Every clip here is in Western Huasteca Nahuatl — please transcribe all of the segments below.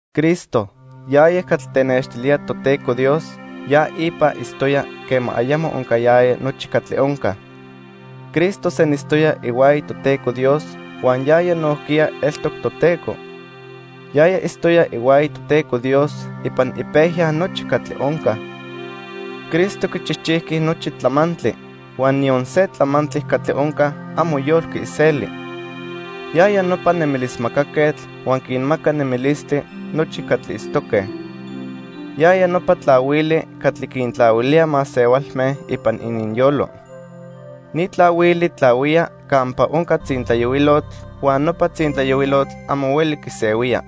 Cristo, yaya catli tenextilía Toteco Dios, ya ipa itztoya quema ayamo oncayaya nochi catli onca. Cristo senitztoya ihuaya Toteco Dios huan yaya nojquiya eltoc Toteco. Yaya itztoya ihuaya Toteco Dios ipan ipejya nochi catli onca. Cristo quichijchijqui nochi tlamantli, huan niyon se tlamantli catli onca amo yolqui iseli. Yaya nopa nemilismacaquetl huan quinmaca nemilistli nochi catli itztoque. Yaya nopa tlahuili catli quintlahuilía masehualme ipan ininyolo. Ni tlahuili tlahuía campa onca tzintlayohuilotl huan nopa tzintlayohuilotl amo hueli quisehuía.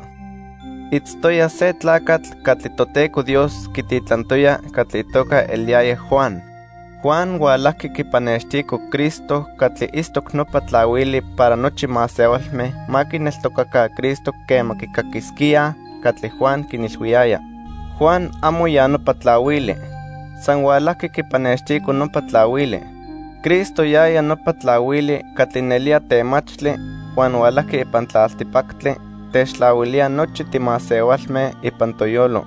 Itztoya se tlacatl catli Toteco Dios quititlantoya catli itoca eliyaya Juan. Juan hualajqui quipannextico Cristo catli itztoc nopa tlahuili para nochi masehualme ma quineltocaca Cristo quema quicaquisquíaj catli Juan quinilhuiyaya. Juan amo ya nopa tlahuili. San hualajqui quipannextico nopa tlahuili. Cristo yaya nopa tlahuili catli nelía temachtli huan hualajqui ipan tlaltipactli techtlahuilía nochi timasehualme ipan toyolo.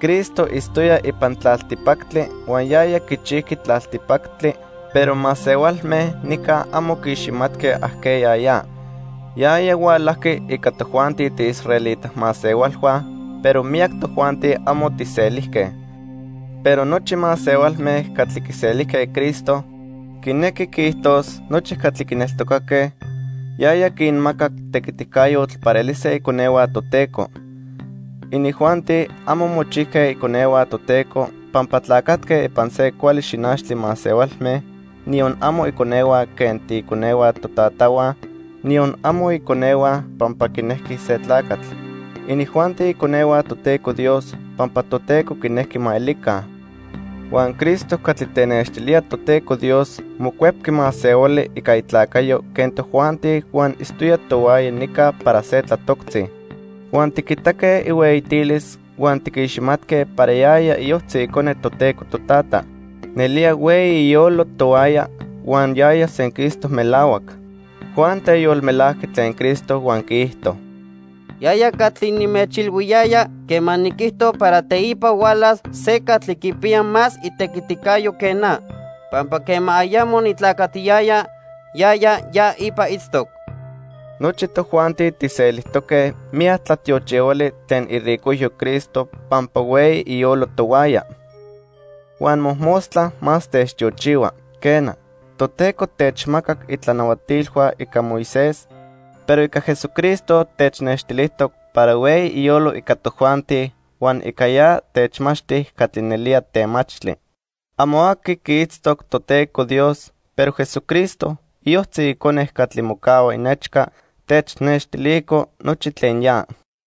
Cristo itztoya ipan tlaltipactli huan yaya quichijqui tlaltipactli, pero masehualme nica amo quiiximatque ajqueya ya. Yaya hualajqui ica tojuanti tiiisraelita masehualhua, pero miyac tojuanti amo tijselijque. Pero nochi masehualme catli quiselijque Cristo, quinequi quiijtos nochi catli quineltocaque, yaya quinmacac tequiticayotl para elise iconehua Toteco. Inijuanti amo mochijque iconehua Toteco pampa tlacatque ipan se cuali xinachtli masehualme, niyon amo iconehua quen tiiconehua totatahua, niyon amo iconehua pampa quinejqui se tlacatl. Inijuanti iconehua Toteco Dios pampa Toteco quinejqui ma elica. Huan Cristo catli tenextilía Toteco Dios mocuepqui masehuali ica itlacayo quen tojuanti huan itztoya tohuaya nica para se tlatoctzi. Huan tiquitaque ihueyitilis huan tiquiximatque para yaya iyojtzi Icone Toteco Totata. Nelía hueyi iyolo tohuaya huan yaya senquistoc melahuac. Juan teyolmelajqui tlen Cristo huan quiijto: "Yaya catli nimechilhuiyaya quema niquijto para teipa hualas se catli quipiya más itequiticayo que na. Pampa quema ayamo nitlacatiyaya, yaya ya ipa itztoc." Nochi tojuanti tijselijtoque miyac tlatiochihuali tlen iricojyo Cristo pampa hueyi iyolo tohuaya. Huan mojmostla más techtiochihua. Quena, Toteco techmacac itlanahuatilhua ica Moisés, pero ica Jesucristo technextilijtoc para hueyi iyolo ica tojuanti huan ica ya techmachti catli nelía temachtli. Amo aqui quiitztoc Toteco Dios, pero Jesucristo, iyojtzi Icone catli mocahua inechca, technextilico nochi tlen ya.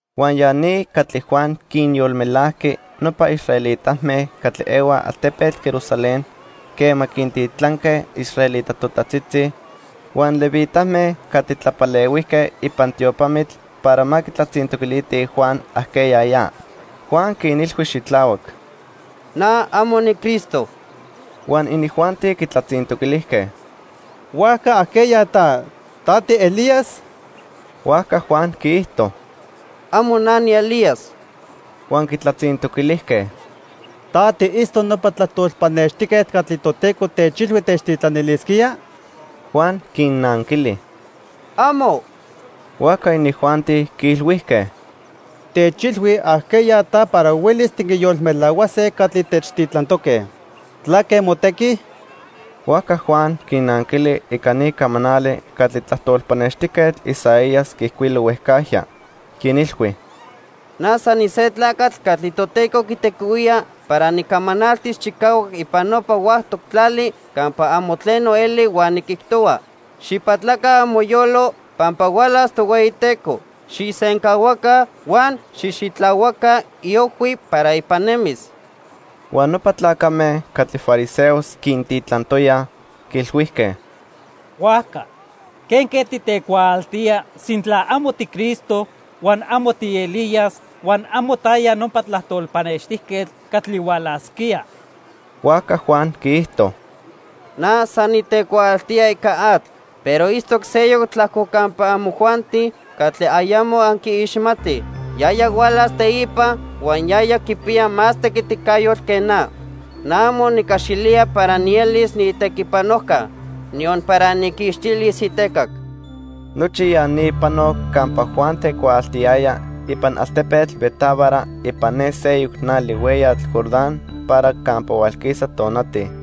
Huan ya ni catli Juan quinyolmelajqui nopa israelitame catli ehuaj altepetl Jerusalén quema quintitlanque israelita totajtzitzi huan levitame catli tlapalehuijque ipan tiopamitl para ma quitlatzintoquilitij Juan ajqueya ya. Juan quinilhui xitlahuac: —Na amo niCristo. Huan inijuanti quitlatzintoquilijque: —¿Huajca ajqueya ta? ¿Ta tiElías? Huajca Juan quiijto: —Amo na niElías. Huan quitlatzintoquilijque: —¿Ta tiitztoc nopa tlajtol pannextijquetl catli Toteco techilhui techtitlanilisquía? Juan quinnanquili: —¡Amo! Huajca inijuanti quiilhuijque: —Techilhui ajqueya ta para huelis tiquinyolmelahuase catli techtitlantoque. ¿Tlaque motequi? Huajca Juan quinnanquili ica ni camanali catli tlajtol pannextijquetl Isaías quiijcuilo huejcajya. Quinilhui: —Na san nise tlacatl catli Toteco quitequihuía para nicamanaltis chicahuac ipan nopa huactoc tlali campa amo tleno eli huan niquijtohua: 'Xijpatlaca amoyolo pampa hualas Tohueyiteco. Xijsencahuaca huan xijxitlahuaca iojhui para ipan nemis.' Huan nopa tlacame catli fariseos quintitlantoyaj, quiilhuijque: —Huajca, ¿quenque titecuaaltía, sintla amo tiCristo, huan amo tiElías, huan amo taya nopa tlajtol pannextijquetl catli hualasquía? Huajca Juan quiijto: —Na san nitecuaaltía ica atl, pero itztoc seyoc tlajco campa amojuanti catli ayamo anquiiximatij. Yaya hualas teipa huan yaya quipiya más tequiticayotl que na. Na amo nicaxilía para nielis niitequipanojca, niyon para nijquixtilis itecac. Nochi ya ni panoc campa Juan tecuaaltiyaya ipan altepetl Betábara ipan ne seyoc nali hueyatl Jordán para campa hualquisa tonati.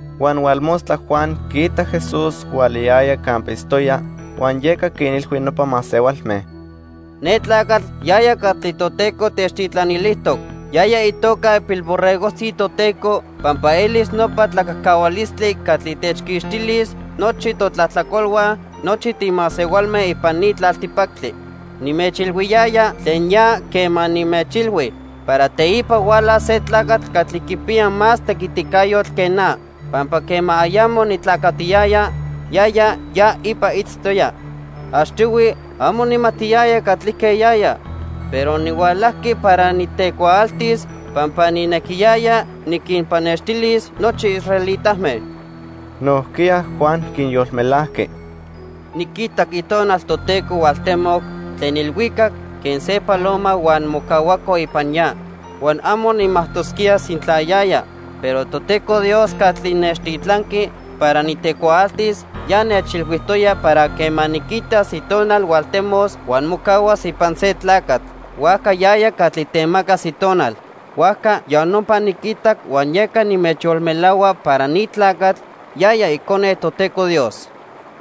Huan hualmostla Juan quiitac Jesús hualayaya campa itztoya, huan yeca quinilhui nopa masehualme: "Ne tlacatl yaya catli Toteco techtitlanilijtoc. Yaya itoca ipilborregojtzi Toteco pampa elis nopa tlacajcahualistli catli techquixtilis nochi totlajtlacolhua nochi timasehualme ipan ni tlaltipactli. Nimechilhuiyaya tlen ya quema nimechilhui para teipa hualas se tlacatl catli quipiya más tequiticayotl que na pampa quema ayamo nitlacatiyaya, yaya ya ipa itztoya. Achtihui amo nijmatiyaya catlique yaya, pero nihualajqui para nitecuaaltis pampa nijnequiyaya niquinpannextilis nochi israelitame." Nojquiya Juan quinyolmelajqui: "Niquitac Itonal Toteco hualtemoc tlen ilhuicac quen se paloma huan mocahuaco ipan ya. Huan amo nijmajtosquía sintla yaya, pero Toteco Dios catli nechtitlanqui para nitecuaaltis ya nechilhuijtoya para quema niquitas Itonal hualtemos huan mocahuas ipan se tlacatl, huajca yaya catli temacas Itonal. Huajca ya nopa niquitac huan yeca nimechyolmelahua para ni tlacatl, yaya Icone Toteco Dios."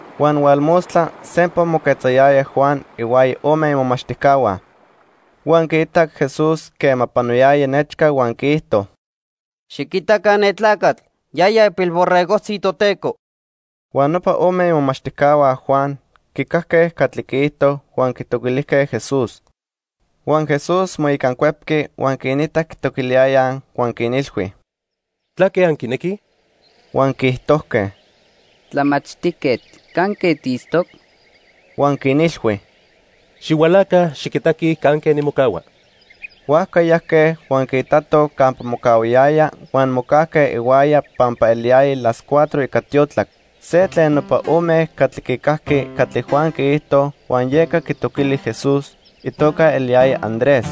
Huan hualmostla sempa moquetzayaya Juan ihuaya ome imomachtijcahua. Huan quiitac Jesús quema panoyaya nechca huan quiijto: —Xiquitaca ne tlacatl, yaya ipilborregojtzi Toteco. Huan nopa ome imomachtijcahua Juan quicajque catli quiijto huan quitoquilijque Jesús. Huan Jesús moicancuepqui huan quinitac quitoquiliyayaj huan quinilhui: —¿Tlaque anquinequij? Huan quiijtojque: —Tlamachtijquetl, ¿canque tiitztoc? Huan quinilhui: —Xihualaca, xiquitaquij canque nimocahua. Huajca yajque huan quiitatoj campa mocahuayaya huan mocajque ihuaya pampa eliyaya las cuatro ica tiotlac. Se tlen nopa ome catli quicajqui catli Juan quiijto huan yeca quitoquili Jesús, itoca eliyaya Andrés.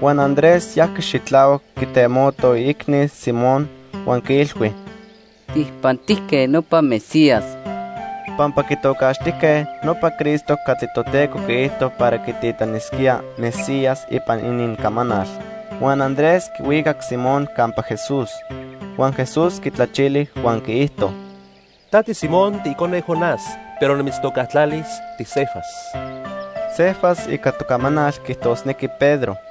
Huan Andrés yajqui xitlahuac quitemoto iicni, Simón, huan quiilhui: —Tijpantijque nopa Mesías. (Pampa quitocaxtijque nopa Cristo catli Toteco quiijto para quititlanisquía 'Mesías' ipan inincamanal.) Huan Andrés quihuicac Simón campa Jesús. Huan Jesús quitlachili huan quiijto: —Ta tiSimón, tiicone Jonás, pero nimitztocatlalis tiCefas. (Cefas ica tocamanal quiijtosnequi Pedro.)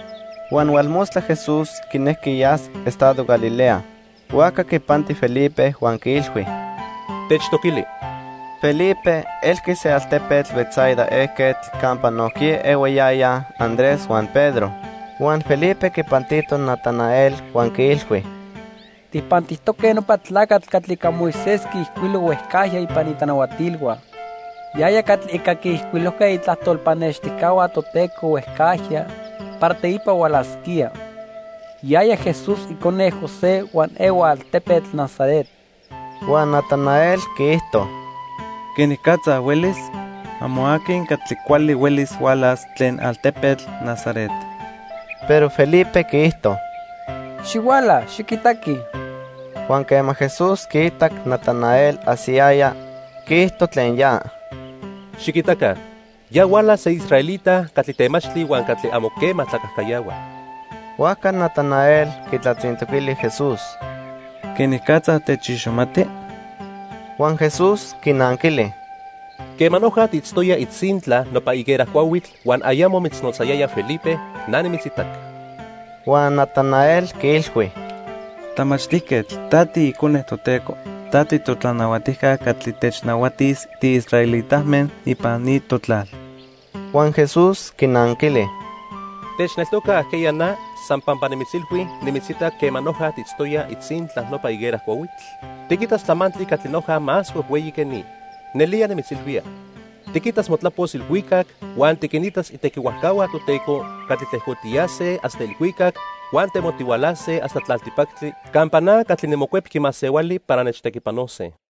Huan hualmostla Jesús quinejqui yas estado Galilea. Huajca quipanti Felipe huan quiilhui: —Techtoquili. Felipe elqui se altepetl Betsaida ejquetl campa nojquiya ehuayayaj Andrés huan Pedro. Huan Felipe quipantito Natanael huan quiilhui: —Tijpantijtoque nopa tlacatl catli ica Moisés quiijcuilo huejcajya ipan itlanahuatilhua. Yaya catli ica quiijcuilojque itlajtol pannextijcahua Toteco huejcajya para teipa hualasquía. Yaya Jesús icone José huan ehua altepetl Nazaret. Huan Natanael quiijto: —¿Quenicatza huelis? Amo aqui catli cuali huelis hualas tlen altepetl Nazaret. Pero Felipe quiijto: —Xihuala, xiquitaqui. Huan quema Jesús quiitac Natanael ajsiyaya, quiijto tlen ya: —Xiquitaca, ya huala se israelita catli temachtli huan catli amo quema tlacajcayahua. Huajca Natanael quitlatzintoquili Jesús: —¿Quenicatza techiximati? Huan Jesús quinanquili: —Quema noja tiitztoya itzintla nopa higuera cuahuitl huan ayamo mitznotzayaya Felipe, na nimitzitac. Huan Natanael quiilhui: —Tlamachtijquetl, ta tiIcone Toteco. Ta titotlanahuatijca catli technahuatis tiisraelitame ipan ni totlal. Huan Jesús quinanquili: —¿Techneltoca ajqueya na san pampa nimitzilhui nimitzitac quema noja tiitztoya itzintla nopa higuera cuahuitl? Tiquitas tlamantli catli noja más huejhueyi que ni. Nelía nimitzilhuía, tiquitas motlapos ilhuicac huan tiquinitas itequihuajcahua Toteco catli tlejcotiyase hasta ilhuicac huan temotihualase hasta tlaltipactli campa na catli niMocuepqui Masehuali para nechtequipanose.